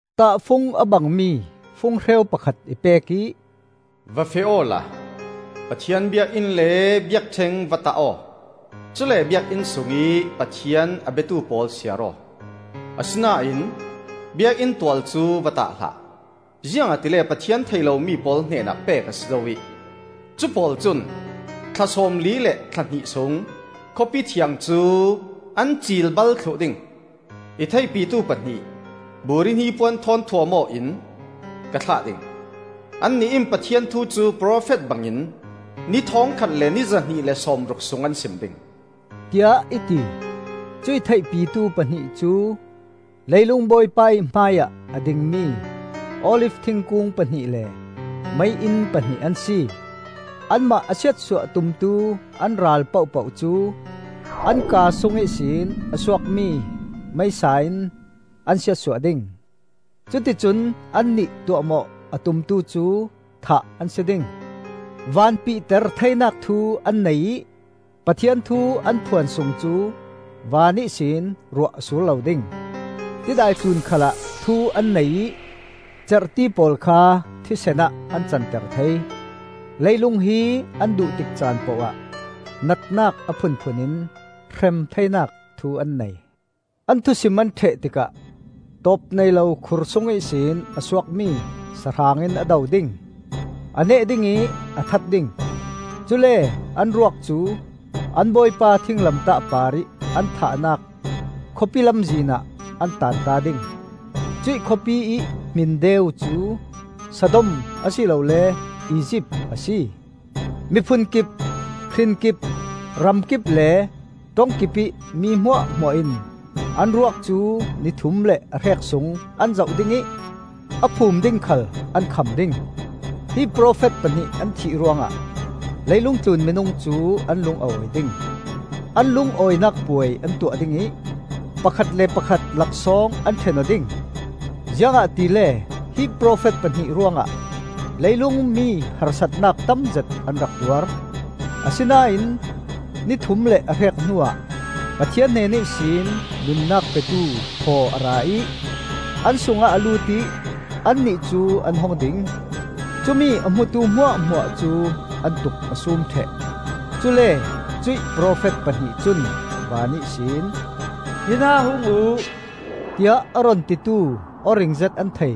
Tahfung a bangmi funghreu pakhat i pek ih, “Va feh awla Pathian biakinn le biakṭheng va tah aw; cule biakinn sungih Pathian a biatu pawl siar aw. Asinain biakinn tual cu va tah hlah, ziangahtile Pathian thei lomi pawl hnenah pek a si zo ih cu pawl cun thla sawmli le thla hnih sung Khawpi Thiang cu an cilbal thluh ding. I theihpitu pahnih, buri hnipuan thawn thuam aw in, ka thlah ding; annih in Pathian thu cu profet bangin ni thawngkhat ni zahnih le sawmruk sung an sim ding,” tiah i ti. Cuih theihpitu pahnih cu leilung Bawipa ih hmaiah a dingmi Olif thingkung pahnih le mei-inn pahnih an si. Anmah a siatsuah tumtu an ral pohpoh cu an kaa sung ihsin a suakmi meisa in an siatsuah ding; cuti cun annih tuahmawh a tumtu cu thah an si ding. Van pihter theinak thu an nei ih Pathian thu an phuan sung cu van ihsin ruah a sur lo ding. Tidai tlun khalah thu an nei ih cerhti pawl kha thisen ah an canter thei. Leilung hi an duh tik caan pohah natnak a phunphun in hrem theinak thu an nei. An thusim an ṭheh tikah tawpneilo khur sung ihsin a suakmi sahrang in a do ding. A neh dingih a that ding. Cule an ruak cu an Bawipa thinglamtah parih an thahnak khawpi lamzin ah an taanta ding. Cuih khawpiih hmin deu cu Sodom a si lole Izipt a si. Miphun kip, hrin kip, ram kip le ṭong kipih mi hmuahhmuah in an ruak cu ni thum le a hrek sung an zoh ding ih a phum ding khal an kham ding. Hi profet pahnih an thih ruangah leilung tlun minung cu an lung a awi ding. An lungawinak puai an tuah ding ih pakhat le pakhat laksawng an ṭhen aw ding, ziangahtile hi profet pahnih ruangah leilung mi harsatnak tamzet an rak tuar. Asinain ni thum le a hrek hnuah Pathian hnen ihsin nunnak petu thaw a ra ih an sungah a lut ih annih cu an hung ding; cumi a hmutu hmuahhmuah cu an tuk a sum ṭheh. Cule cuih profet pahnih cun van ihsin, “Hinah hung uh,” tiah a run titu aw ringzet an thei.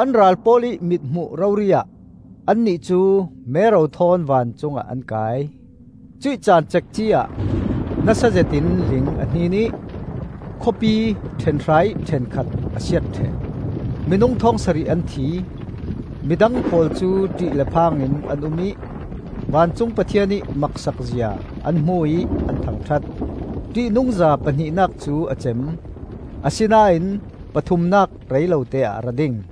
An ral pawl ih mithmuh rori-ah annih cu mero thawn vancungah an kai. Cuih caan cekci-ah nasazet in ling a hnin ih khawpi ṭhenhra ih ṭhenkhat a siat ṭheh; minung thawng sarih an thi. Midang pawl cu ṭih le phangin an um ih vancung Pathian ih maksak zia an hmu ih an thangṭhat. Ṭihnungza pahnihnak cu a cem, asinain pathumnak rei lote-ah a ra ding.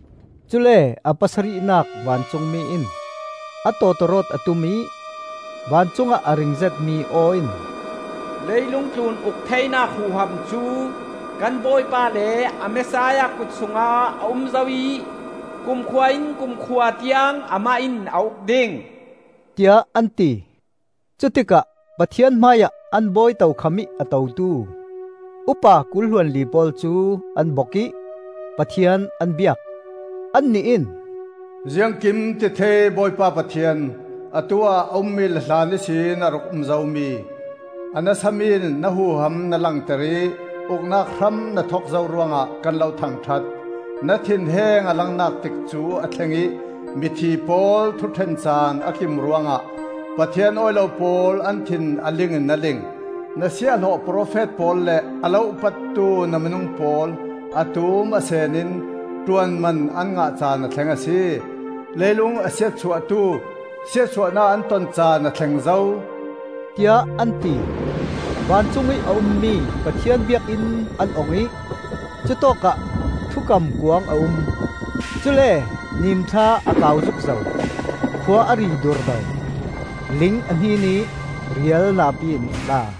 Cule a pasarihnak vancungmi in a tawtawrawt a tum ih vancungah a ring zetmi aw in, “Leilung tlun uk theinak huham cu kan Bawipa le a Messiah kut sungah a um zo ih kumkhua-in kumkhua tiang amah in a uk ding,” tiah an ti. Cutikah Pathian hmaiah an bawi tokham ih a totu upa kul hluanli pawl cu an bok ih Pathian an biak, Annih in, “Ziangkimtithei Bawipa Pathian, atu-ah a ummi le hlan ihsin a rak um zomi! A nasami na huham na langter ih uknak hram na thok zo ruangah kan lo thangṭhat. Na thinheng a langnak tikcu a thleng ih mithi pawl thuṭhen caan a kim ruangah, Pathian awi lo pawl an thin a ling in a ling. Na siahhlawh profet pawl le a lo upattu na minung pawl a tum a seen in ṭuanman an ngah caan a thleng a si. Leilung a siatsuahtu siatsuahnak an ton caan a thleng zo,” tiah an ti. Vancung ih a ummi Pathian biakinn an ong ih cutawkah Thukam Kuang a um. Cule nimthla a kau zukzo, khua a ri durdo, ling a hnin ih rial napi in a tla.